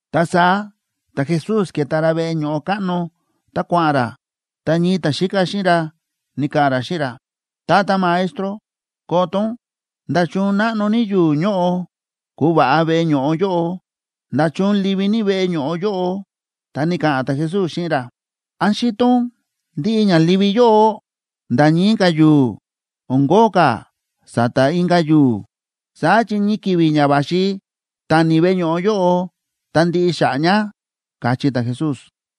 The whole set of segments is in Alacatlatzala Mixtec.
Ta saá ta̱Jesús ke̱ta ra veꞌe ño̱ꞌo káꞌno ta kua̱ꞌa̱n ra, ta ñii ta̱xíka xíꞌin ra ni̱ka̱ꞌa̱n ra xíꞌin ra: ―Tata Maestro, koto ún, ¡nda̱chun náꞌno ní yu̱u̱ ñóꞌo ku̱va̱ꞌa veꞌe ño̱ꞌo yóꞌo! ¡Nda̱chun livi ní veꞌe ño̱ꞌo yóꞌo! Ta ni̱ka̱ꞌa̱n ta̱Jesús xíꞌin ra: ―¿Án xíto ún ndiꞌi ña livi yóꞌo? Nda̱ ñii ka̱ yu̱u̱ o̱n kóo ka̱ sa̱ta̱ inka̱ yu̱u̱. Saá chi ñii ki̱vi̱ ña va̱xi tani veꞌe ño̱ꞌo yóꞌo ta ndiꞌi xa̱ꞌa̱ ña ―káchí ta̱Jesús.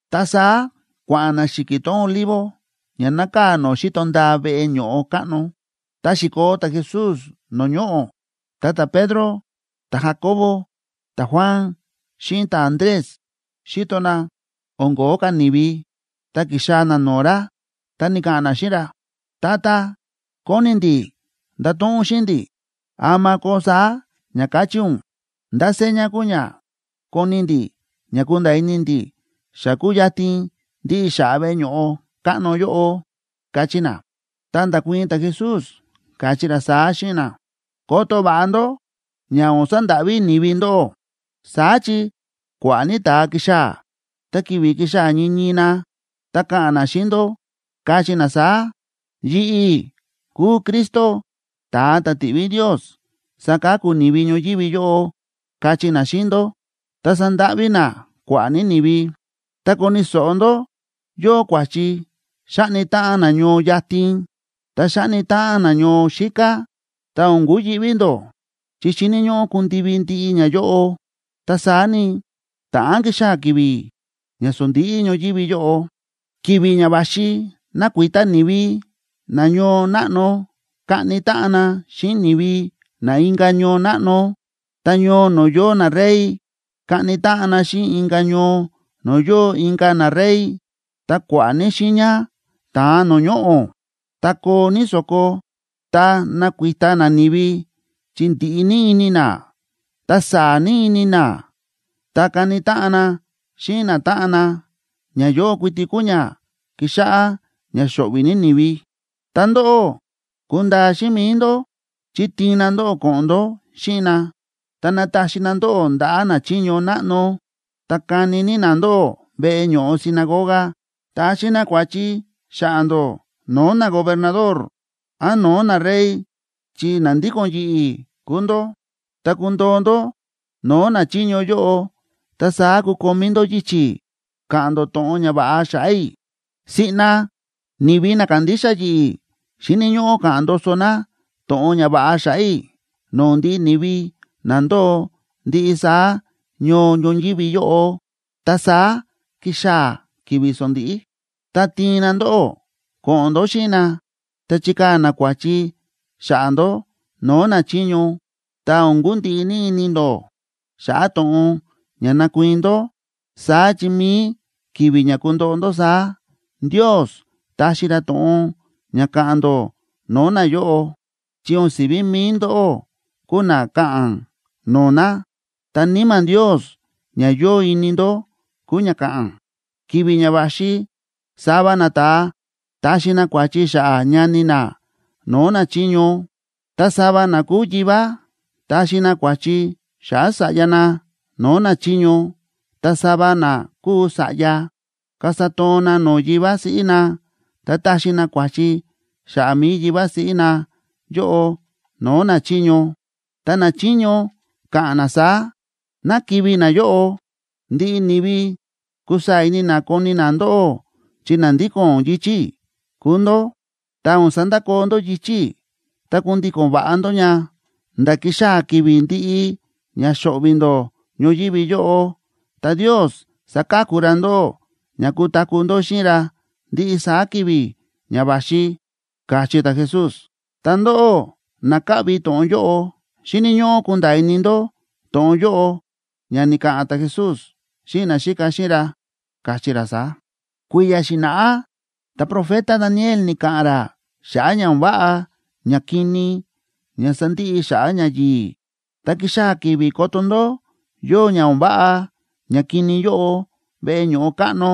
Ta saá kua̱ꞌa̱n na xi̱ki̱ tón Olivo ña nákaa̱ no̱o̱ xíto ndaa veꞌe ño̱ꞌo káꞌno. Ta xi̱koo ta̱Jesús no̱o̱ ñoꞌo̱, ta ta̱Pedro, ta̱Jacobo, ta̱Juan xíꞌin ta̱Andrés xi̱to na o̱n ko̱ó ka̱ ni̱vi, ta ki̱xaa̱ na no̱o̱ ra, ta ni̱ka̱ꞌa̱n na xíꞌin ra: ―Tata, kóni ndi̱ ndato̱ꞌon ún xíꞌin ndi̱, ¿ama koo saá ña ka̱chí ún? ¿Ndá seña kuu ña koni ndi̱ ña kunda̱a̱ ini ndi̱ xa kúyatin ndiꞌi xa̱ꞌa̱ veꞌe ño̱ꞌo káꞌno yóꞌo? ―káchí na. Ta nda̱kuii̱n ta̱Jesús, káchí ra saá xíꞌin na: ―Koto va̱ꞌa ndó ña o̱n sandáꞌví ni̱vi ndóꞌó. Saá chi kua̱ꞌa̱ ní ta̱a kixaa̱, ta ki̱vi̱ kixaa̱ ñii ñii na, ta ka̱ꞌa̱n na xíꞌin ndó, kachí na saá: “Yi̱ꞌi̱ kúu Cristo, ta̱a ta̱ ti̱ꞌví Ndios saka̱ku ni̱vi ñoyívi yóꞌo”, kachí na xíꞌin ndó, ta sandáꞌví na kua̱ꞌa̱ ní ni̱vi. ’Ta koni̱ so̱ꞌo ndó yóo kua̱chi xáꞌni táꞌan na ñoo yatin, ta xáꞌni táꞌan na ñoo xíká, ta o̱n kuyi̱ꞌví ndó. Chi xíni̱ ñóꞌó kundivi ndiꞌi ñayóꞌo, ta saá ni, ta̱ꞌán kixaa̱ ki̱vi̱ ña sondíꞌí ñoyívi yóꞌo. Ki̱vi̱ ña va̱xi nakuita ni̱vi na ñoo náꞌno kaꞌni táꞌan na xíꞌin ni̱vi na inka̱ ñoo náꞌno, ta ñoo no̱o̱ yóo narey kaꞌni táꞌan na xíꞌin inka̱ ñoo no̱o̱ yóo inka̱ narey. Ta kua̱ꞌa̱ ní xiiña ta̱an no̱o̱ ñoꞌo̱, ta koo ní so̱ko, ta nakuita nani̱vi chi ndiꞌi ní ini na, ta saa̱ ní ini na, ta kani táꞌan na xíꞌin natáꞌan na. Ñayóꞌo kuiti kuu ña kixáꞌá ña xo̱ꞌvi̱ ní ni̱vi. ’Ta ndóꞌó, kundaa xíꞌin mi̱i ndó, chi tiin na ndóꞌó ko̱ꞌo̱n ndó xíꞌin na, ta nataxi na ndóꞌó ndaꞌa̱ nachiño náꞌno, ta kani ní na ndóꞌó veꞌe ño̱ꞌo sinagoga. Taxi na kua̱chi xa̱ꞌa̱ ndó no̱o̱ nagobernador án no̱o̱ narey chi na ndíko̱n yi̱ꞌi̱ kúu ndó. Tá kundoo ndó no̱o̱ nachiño yóꞌo, ta saá kukomí ndó yichi̱ ka̱ꞌa̱n ndó to̱ꞌon ñava̱ꞌa xa̱ꞌa̱ i̱. Siꞌna ni̱vi na kándixa yi̱ꞌi̱ xíni̱ ñóꞌó ka̱ꞌa̱n ndoso na to̱ꞌon ñava̱ꞌa xa̱ꞌa̱ i̱ no̱o̱ ndiꞌi ni̱vi na ndóo ndiꞌi saá ñoo ñoyívi yóꞌo, ta saá kixaa̱ ki̱vi̱ sondíꞌí. Tá tiin na ndóꞌó ko̱ꞌo̱n ndó xíꞌin na, ta chikaa̱ na kua̱chi xa̱ꞌa̱ ndó no̱o̱ nachiño, ta o̱n kundiꞌi ini ndó xa̱ꞌa̱ to̱ꞌon ña ndakuii̱n ndó. Saá chi mi̱i ki̱vi̱ ña kundoꞌo ndó saá, Ndios taxi ra to̱ꞌon ña ka̱ꞌa̱n ndó no̱o̱ nayóꞌo, chi o̱n si̱ví mi̱i ndóꞌó kuu na ka̱ꞌa̱n no̱o̱ na, ta Níma̱ Ndios ña yóo ini ndó kuu ña ka̱ꞌa̱n. Ki̱vi̱ ña va̱xi sava nata̱a taxi na kua̱chi xa̱ꞌa̱ ñani na no̱o̱ nachiño, ta sava na kúu yivá taxi na kua̱chi xa̱ꞌa̱ sa̱ꞌya na no̱o̱ nachiño. Ta sava na kúu sa̱ꞌya kasa toon na no̱o̱ yivá siꞌí na, ta taxi na kua̱chi xa̱ꞌa̱ mi̱i yivá siꞌí na yóꞌo no̱o̱ nachiño, ta nachiño ka̱ꞌa̱n na saá: “Ná kivi̱ nayóꞌo.” Ndiꞌi ni̱vi kusaa̱ ini na koni na ndóꞌó chi na ndíko̱n yichi̱ i̱ kúu ndó. Tá o̱n sandakoo ndó yichi̱ i̱ ta kundíko̱n va̱ꞌa ndó ña, nda̱ kixaa̱ ki̱vi̱ ndi̱ꞌi ña xo̱ꞌvi̱ ndó ñoyívi yóꞌo, ta Ndios saka̱ku ra ndóꞌó ña kutaku̱ ndó xíꞌin ra ndiꞌi saá ki̱vi̱ ña va̱xi ―káchí ta̱Jesús. Ta ndóꞌó na káꞌvi to̱ꞌon yóꞌo, xíni̱ ñóꞌó kunda̱a̱ ini ndó to̱ꞌon yóꞌo ña ni̱ka̱ꞌa̱n ta̱Jesús xíꞌin naxíka xíꞌin ra, káchí ra saá: ―Kui̱ya̱ xi̱na̱ꞌá ta̱profeta Daniel ni̱ka̱ꞌa̱n ra xa̱ꞌa̱ ña o̱n váꞌa ñakini ña sandiꞌi xa̱ꞌa̱ ñayi̱i̱. Ta kixaa̱ ki̱vi̱ koto ndó yóo ña o̱n váꞌa ñakini yóꞌo veꞌe ño̱ꞌo káꞌno,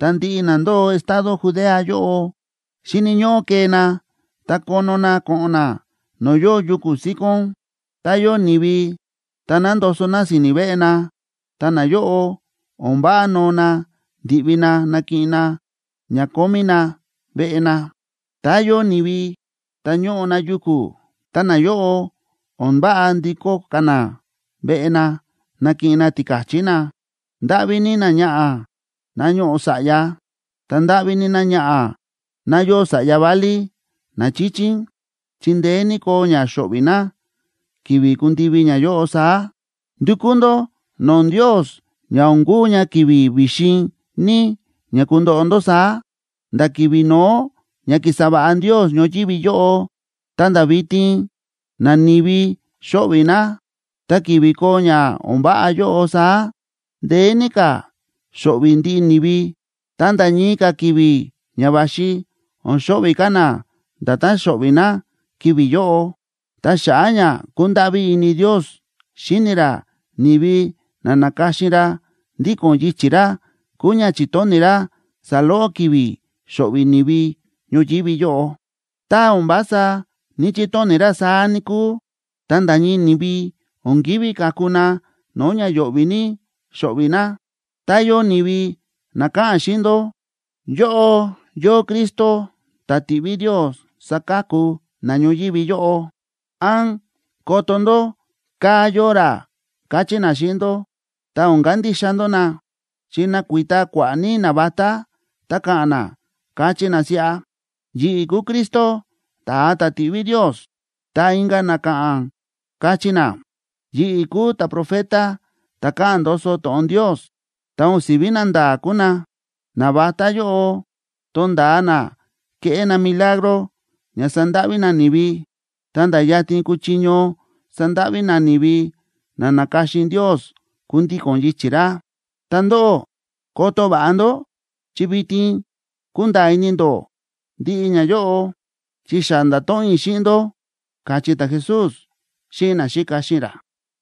ta ndiꞌi na ndóo estado Judea yóꞌo, xíni̱ ñóꞌó kee na ta kono na ko̱ꞌo̱n na no̱o̱ yóo yuku̱ síkón. Tá yóo ni̱vi ta nándoso na si̱ni̱ veꞌe na, ta nayóꞌo o̱n váꞌa noo na ndi̱ꞌvi na nakiꞌin na ña kómí na veꞌe na. Tá yóo ni̱vi ta ñóꞌo na yuku̱, ta nayóꞌo, o̱n váꞌa ndikó ka̱ na veꞌe na nakiꞌin na tika̱chí na. ¡Ndáꞌví ní náñaꞌa̱ ná ñóꞌo sa̱ꞌya, ta ndáꞌví ní náñaꞌa̱ ná yóo sa̱ꞌya válí na chíchín, chi ndeé ní koo ña xo̱ꞌvi̱ ná ki̱vi̱ kundivi ñayóꞌo saá! Ndukú ndó no̱o̱ Ndios ña o̱n kuu ña ki̱vi̱ vi̱xin ní ña kundoꞌo ndó saá. Nda̱ ki̱vi̱ no̱ó ña ki̱sa va̱ꞌa Ndios ñoyívi yóꞌo ta̱nda̱ vitin, nani̱vi xóꞌvi̱ na. Ta ki̱vi̱ koo ña o̱n váꞌa yóꞌo saá, ndeé ní ka̱ xo̱ꞌvi̱ ndiꞌi ni̱vi. Ta nda̱ ñii ka̱ ki̱vi̱ ña va̱xi o̱n xo̱ꞌvi̱ ka̱ na nda̱tán xo̱ꞌvi̱ na ki̱vi̱ yóꞌo. Ta xa̱ꞌa̱ ña kúndáꞌví ini Ndios xíni ra ni̱vi na na̱ka̱xin ra ndíko̱n yichi̱ ra kúu ña chi̱tóni̱ ra saloꞌo ki̱vi̱ xo̱ꞌvi̱ ni̱vi ñoyívi yóꞌo. Tá o̱n vása ní‑chitóni̱ ra saá, níkúu, ta nda̱ ñii ni̱vi o̱n kívi ka̱ku na no̱o̱ ña yo̱ꞌvi̱ ní xóꞌvi̱ na. ’Tá yóo ni̱vi na ka̱ꞌa̱n xíꞌin ndó: “Yóꞌo yóo Cristo ta̱ ti̱ꞌví Ndios saka̱ku na ñoyívi yóꞌo”, án “Koto ndó, kaa̱ yóo ra”, kachí na xíꞌin ndó, ta o̱n kandixa ndó na. Chi nakuita kua̱ꞌa̱ ní navatá ta ka̱ꞌa̱n na, kachí na siꞌa: “Yi̱ꞌi̱ kúu Cristo ta̱a ta̱ ti̱ꞌví Ndios”, ta inka̱ na ka̱ꞌa̱n, kachí na: “Yi̱ꞌi̱ kúu ta̱profeta ta̱ káꞌa̱n ndoso to̱ꞌon Ndios”, ta o̱n si̱ví nanda̱a̱ kúu na. Navatá yóꞌo tonda̱a na keꞌé na milagro ña sandáꞌví na ni̱vi, ta̱nda̱ yatin kuchiño sandáꞌví na ni̱vi na na̱ka̱xin Ndios kundíko̱n yichi̱ ra. Ta ndóꞌó koto va̱ꞌa ndó, chi vitin kúnda̱a̱ ini ndó ndiꞌi ñayóꞌo, chi xa nda̱to̱ꞌon i̱ xíꞌin ndó ―káchí ta̱Jesús xíꞌin naxíka xíꞌin ra.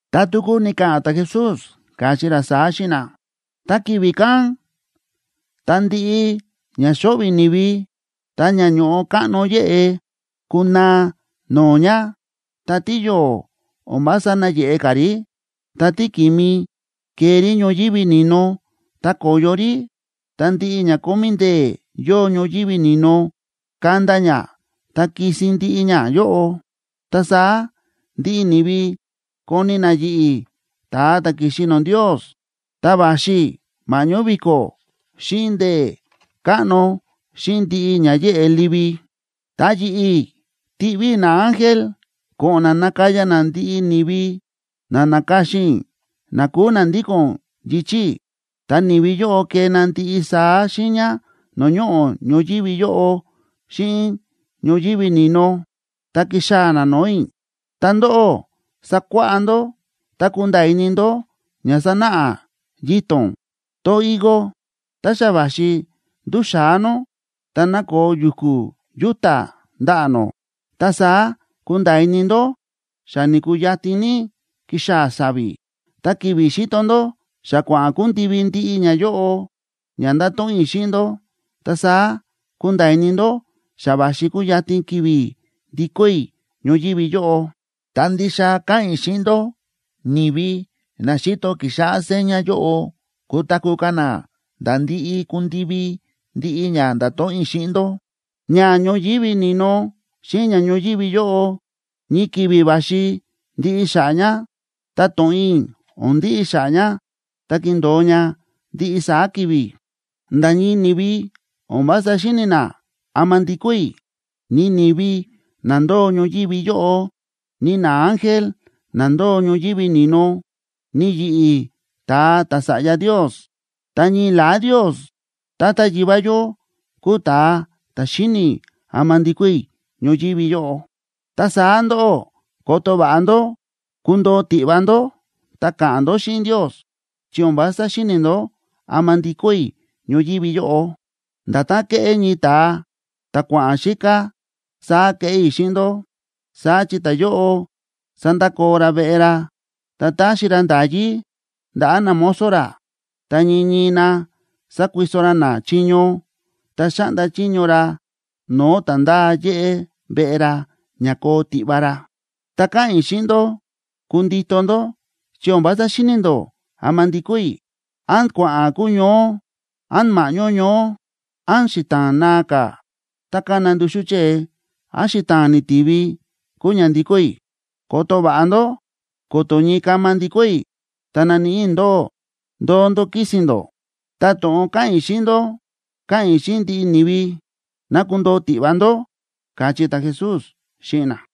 Ta tuku ni̱ka̱ꞌa̱n ta̱Jesús, káchí ra saá xíꞌin na: ―Ta ki̱vi̱ kán, tá ndiꞌi ña xóꞌvi̱ ni̱vi, ta ña ño̱ꞌo káꞌno yéꞌe kunaa no̱o̱ ña, ta tíyo̱o̱ o̱n vása nayeꞌe ka̱ rí, ta tíki̱mi kee rí ñoyívi ni̱no ta ko̱yo rí, ta ndiꞌi ña kómí ndee̱ yóo ñoyívi ni̱no kanda ña ta kisin ndiꞌi ñayóꞌo. Ta saá ndiꞌi ni̱vi koni na yi̱ꞌi̱, ta̱a ta̱ ki̱xi no̱o̱ Ndios, ta va̱xi i̱ ma̱ꞌñó vi̱ko̱, xíꞌin ndee̱ káꞌno, xíꞌin ndiꞌi ña yéꞌe livi. Ta yi̱ꞌi̱ tiꞌví i̱ naángel ko̱ꞌo̱n na nakaya na ndiꞌi ni̱vi na na̱ka̱xin i̱ na kúu na ndíko̱n yichi̱ i̱. Ta ni̱vi yóꞌo kee na ndiꞌi saá xiiña no̱o̱ ñoꞌo̱ ñoyívi yóꞌo xíꞌin ñoyívi ni̱no, ta kixaa̱ na no̱o̱ i̱. ’Ta ndóꞌó, sakuáꞌá ndó ta kunda̱a̱ ini ndó ña sánáꞌa yito̱n tón higo: Tá xa va̱xi nduxa̱á nó, ta nákoo yu̱ku̱ yúta̱ ndaꞌa̱ nó, ta saá kunda̱a̱ ini ndó xa ni̱kuu yatin ní kixaa̱ sa̱vi̱. Ta ki̱vi̱ xíto ndó xa kua̱ꞌa̱n kundivi ndiꞌi ñayóꞌo ña nda̱to̱ꞌon i̱ xíꞌin ndó, ta saá kunda̱a̱ ini ndó xa va̱xi kuyatin ki̱vi̱ ndikó i̱ ñoyívi yóꞌo. Ta ndixa káꞌa̱n i̱ xíꞌin ndó, ni̱vi na xíto kixáꞌá seña yóꞌo kutaku̱ ka̱ na nda̱ ndi̱ꞌi ku̱ndivi ndiꞌi ña nda̱to̱ꞌon i̱ xíꞌin ndó. Ña ñoyívi ni̱no xíꞌin ña ñoyívi yóꞌo ñii ki̱vi̱ va̱xi ndiꞌi xa̱ꞌa̱ ña, ta to̱ꞌon i̱ o̱n ndiꞌi xa̱ꞌa̱ ña, ta kindo̱o ña ndiꞌi saá ki̱vi̱. ’Nda̱ ñii ni̱vi o̱n vása xíni̱ na ama ndikó i̱, ni ni̱vi na ndóo ñoyívi yóꞌo, ni naángel na ndóo ñoyívi ni̱no, ni yi̱ꞌi̱ ta̱a ta̱Sa̱ꞌya Ndios. Ta ñii la̱á Ndios Tata Yivá yó kúu ta̱a ta̱ xíni̱ ama ndikó i̱ ñoyívi yóꞌo. ’Ta saá ndóꞌó, koto va̱ꞌa ndó, kundoo tiꞌva ndó ta ka̱ꞌa̱n ndó xíꞌin Ndios, chi o̱n vása xíni̱ ndó ama ndikó i̱ ñoyívi yóꞌo. Nda̱tán ke̱ꞌé ñii ta̱a ta̱ kua̱ꞌa̱n xíká, saá kéꞌé i̱ xíꞌin ndó. Saá chi ta̱yóꞌo sa̱ndakoo ra veꞌe ra, ta ta̱xi ra nda̱yí ndaꞌa̱ namozo ra, ta ñii ñii na sa̱kuiso ra na chiño, ta xa̱ꞌnda chiño ra no̱o̱ ta̱ ndáa yéꞌé veꞌe ra ña koo tiꞌva ra. Ta káꞌa̱n i̱ xíꞌin ndó, kundito ndó chi o̱n vása xíni̱ ndó ama ndikó i̱, án kua̱ꞌa̱n kuñoó, án ma̱ꞌñó ñoó, án xita̱a̱n naa ka̱ ta kána nduxú chée, án xita̱a̱n ni̱tivi, kuu ña ndikó i̱. Koto va̱ꞌa ndó ko̱to̱ ñii kama ndikó i̱, ta naníꞌi i̱ ndóꞌó ndóo ndó kísi̱n ndó. Ta to̱ꞌon káꞌa̱n i̱ xíꞌin ndó, káꞌa̱n i̱ xíꞌin ndiꞌi ni̱vi: Ná kundoo tiꞌva ndó ―káchí ta̱Jesús xíꞌin na.